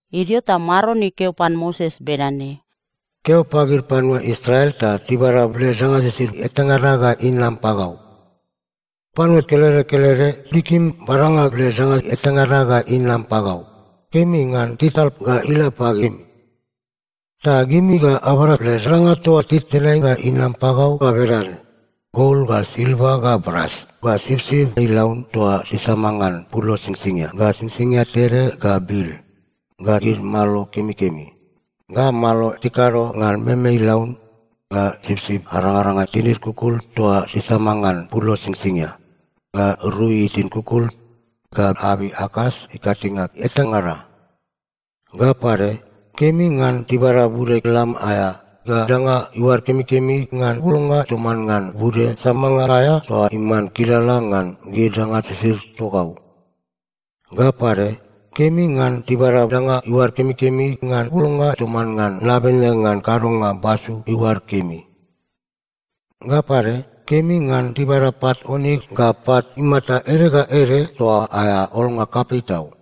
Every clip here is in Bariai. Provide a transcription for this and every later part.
Idio ta Maron ikeo pan Moses bedane, “Keo pagid panua Israel ta tibada led danga sisid etangada ga inam pagau. Panua kelede kelede tikim badanga led danga etangada ga inam pagau, kemi ngan tital ga ila pagimi. Ta gimi ga abada led danga toa titenai ga inam pagau ga bedane: gol, ga silva, ga bras, ga sipsip ilaun toa tisama ngan pulo singsingia ga singsingia tede ga bil, ga gid malo kemikemi, ga malo tikado ngan meme ilaun, ga sipsip arangaranga tinid kukul toa tisama ngan pulo singsingia, ga rui tinid kukul, ga abei akas ikatinge etangada. Ga pade, kemi ngan tibada bude lam aea ga danga iuad kemikemi ngan bulnga toman ngan bude samanga aea toa iman kilala ngan gid danga sisid togau. Ga pade, kemi ngan tibada danga iuad kemikemi ngan bulnga toman ngan nabene ngan kadonga basu iuad kemi. Ga pade, kemi ngan tibada pat oniks ga pat imata ede ga ede toa aea olnga kapei tau,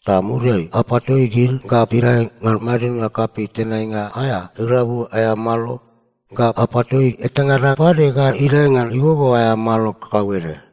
ta muriai apatoi gid ga tidae ngan madidnga kapei tenainga aea irabu aea malo, ga apatoi etangada pade ga idae ngan igogo aea malo kakauede.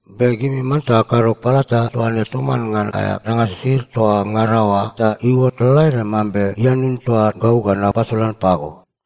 Be gimi manta akado palata toa ne toman ngan aea danga sisid toa ngada oa ta iuot lalaede mambe ianun toa gau ga napasolan pago.”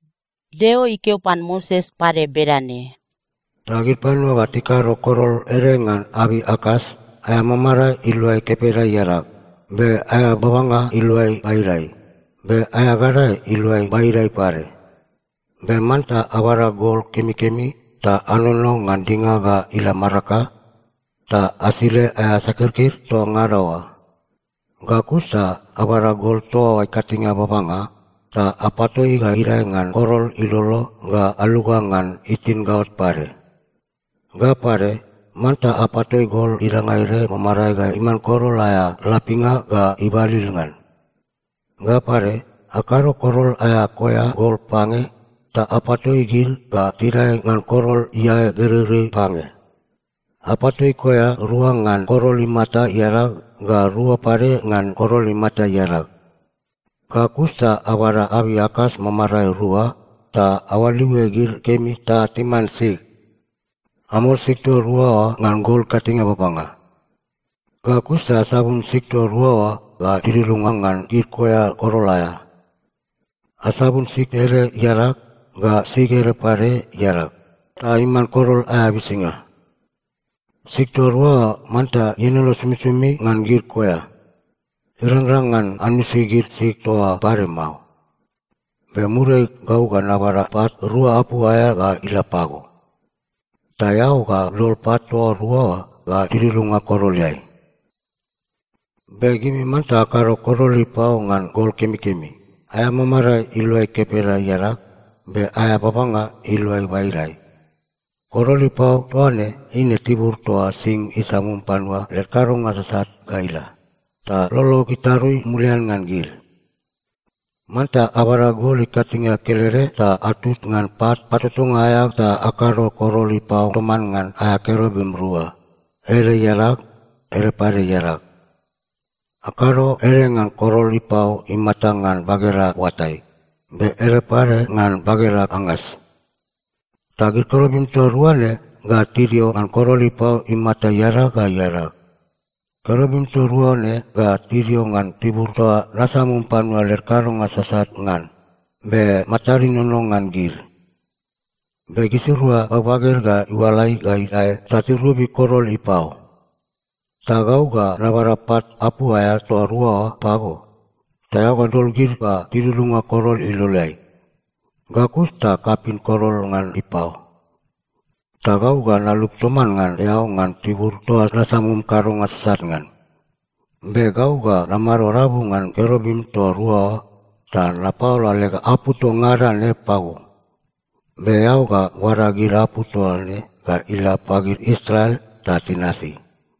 Deo ikeo pan Moses pade bedane, “Ta gid panua ga tikado korol ede ngan abei akas, aea mamarae iluai kepeda iadag, be aea babanga iluai baidai, be aea gadae iluai baidai pade. Be manta abada gol kemikemi ta anono ngan dinga ga ila maraka, ta asile aea sakirkir toa ngada oa. Ga kus ta abada gol toa oa ikatinge babanga, ta apatoi ga idae ngan korol ilolo ga aluga ngan itin gaot pade. Ga pade, manta apatoi gol idanga ede mamarae ga iman korol aea lapinga ga ibalil ngan. Ga pade, akado korol aea koea gol pange ta apatoi gid ga tidae ngan korol iae gereirei pange. Apatoi koea rua ngan korol imata iadag, ga rua pade ngan korol imata iadag. Ga kus ta abada abei akas mamarae rua ta aoaliue gid kemi ta timan sig. Amol sig toa rua oa ngan gol ikatinge babanga. Ga kus ta asabun sig toa rua oa ga tidudunga ngan gid koea korol aea. Asabun sig ede iadag, ga sig ede pade iadag, ta iman korol aea bisinga. Sig toa rua oa manta ienono somisomi ngan gid koea. Irangrang ngan anusi gid sig toa oa pade mao. Be muriai gau ga nabada pat rua apu aea ga ila pago. Ta eao ga dol pat toa rua oa ga tidudunga koroleai. “Be gimi manta akado korol ipao ngan gol kemikemi, aea mamarae iluai kepeda iadag, be aea babanga iluai baidai. Korol ipao toa ne eine tibur toa sing isamum panua led kadonga sasat ga ila, ta lolog itarui mulian ngan gid. Manta abada gol ikatinge kelede ta atut ngan pat patotonga aea ta akado korol ipao toman ngan aea kerubim rua, ede iadag, ede pade iadag. Akado ede ngan korol ipao imata ngan bageda oatai, be ede pade ngan bageda angas. Ta gid kerubim toa rua ne ga tidio ngan korol ipao imata iadag ga iadag. Kerubim toa rua ne ga tidio ngan tibur toa nasamum panua led kadonga sasat ngan, be matad inono ngan gid. Be gisirua bagbaged ga iualai ga idae ta tirobi korol ipao. Ta gau ga nabada pat apu aea toa rua oa pago, ta eao ga dol gid ga tidudunga korol iloleai. Ga kus ta kapin korol ngan ipao. Ta gau ga nalup toman ngan eao ngan tibur toa nasamum kadonga sasat ngan. Be gau ga namado rabu ngan kerubim toa rua oa ta napaola leg apu toa ngada ne pago. Be eao ga bada gid apu toa ne ga ila pagid Israel ta tinasi.”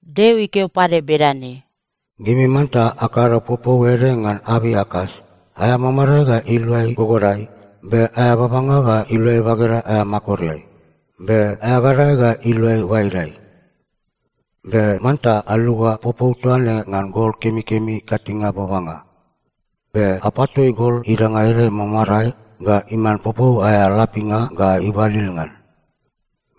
Deo ikeo pade bedane, “Gimi manta akado popou ede ngan abei akas, aea mamarae ga iluai gogodai, be aea babanga ga iluai bageda aea makoreai, be aea gadae ga iluai baidai. Be manta aluga popou toa ne ngan gol kemikemi ikatinge babanga. Be apatoi gol idanga ede mamarae ga iman popou aea lapinga ga ibalil ngan.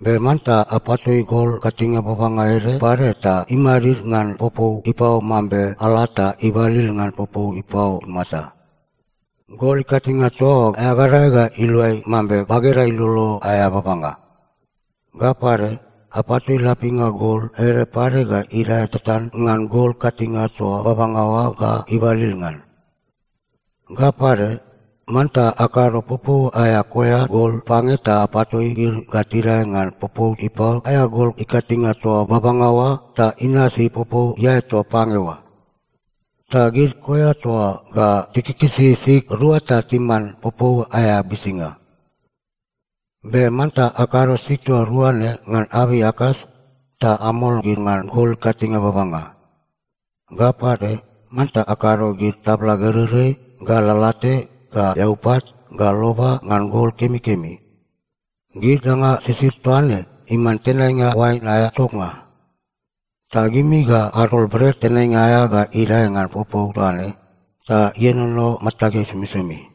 Be manta apatoi gol ikatinge babanga ede pade ta imadid ngan popou ipao mambe ala ta ibalil ngan popou ipao imata. Gol ikatinge toa oa aea gadae ga iluai mambe bageda ilolo aea babanga. Ga pade, apatoi lapinga gol ede pade ga idae tatan ngan gol ikatinge toa babanga oa ga ibalil ngan. Ga pade, manta akado popou aea koea gol pange ta apatoi gid ga tidae ngan popou ipao aea gol ikatinge toa babanga oa ta inasi popou iae toa pange oa. Ta gid koea toa oa ga tikikisi sig rua ta timan popou aea bisinga. Be manta akado sig toa rua ne ngan abei akas ta amol gid ngan gol ikatinge babanga. Ga pade, manta akado gid tabla gereirei ga lalate ga eaupat ga loba ngan gol kemikemi. Gid danga sisid toa ne iman tenainga oain aea toknga. Ta gimi ga adol bret tenainga aea ga idae ngan popou toa ne, ta ienono matageai somisomi.”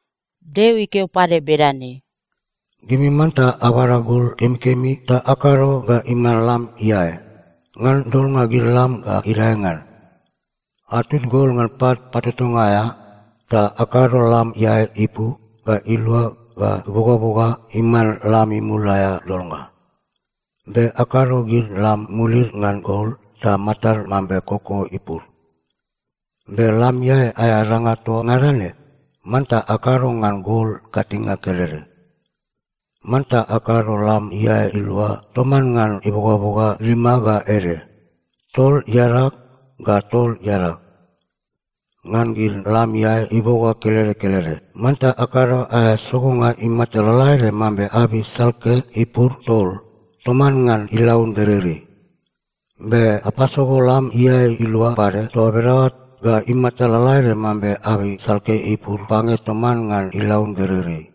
Deo ikeo pade bedane, “Gimi manta abada gol kemikemi ta akado ga iman lam iae, ngan dolnga gid lam ga idae ngan. Atut gol ngan pat patotonga aea ta akado lam iae ipu ga ilua ga ibogaboga iman lam imul aea dolnga. Be akado gid lam mulid ngan gol ta matad mambe koko ipur. Be lam iae aea danga toa ngada ne, manta akado ngan gol ikatinge kelede. Manta akado lam iae ilua toman ngan ibogaboga lima ga ede, tol iadag ga tol iadag. Ngan gid lam iae iboga kelede kelede, manta akado aea sogonga imata lalaede mambe abei salke ipur tol toman ngan ilaun gereirei. Be apasogo lam iae ilua pade toa bedaoa ga imata lalaede mambe abei salke ipur pange toman ngan ilaun gereirei.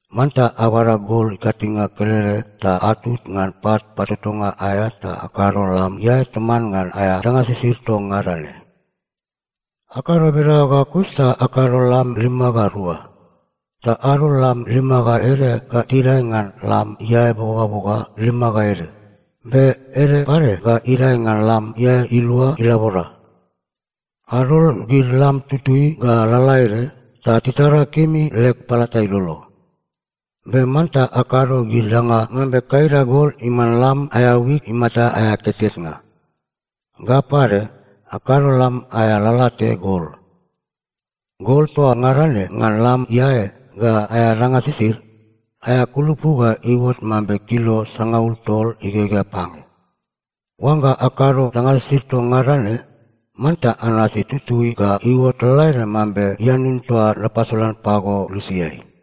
Manta abada gol ikatinge kelede ta atut ngan pat patotonga aea ta akado lam iae toman ngan aea danga sisid toa ngada ne. “Akado bedaoa ga kus ta akado lam lima ga rua. Ta adol lam lima ga ede ga tidae ngan lam iae ibogaboga lima ga ede, be ede pade ga idae ngan lam iae ilua ilabora. Adol gid lam tutui ga lalaede ta titara kemi leg palata ilolo. Be manta akado gid danga mambe kaida gol iman lam aea wik imata aea ketketnga. Ga pade, akado lam aea lalate gol. Gol toa ngada ne ngan lam iae ga aea danga sisid, aea kulupu ga iuot mambe kilo sangaul tol igegea pange. Oangga akado danga sisid toa ngada ne, manta anasi tutui ga iuot lalaede mambe ianun toa napasolan pago lusiai.”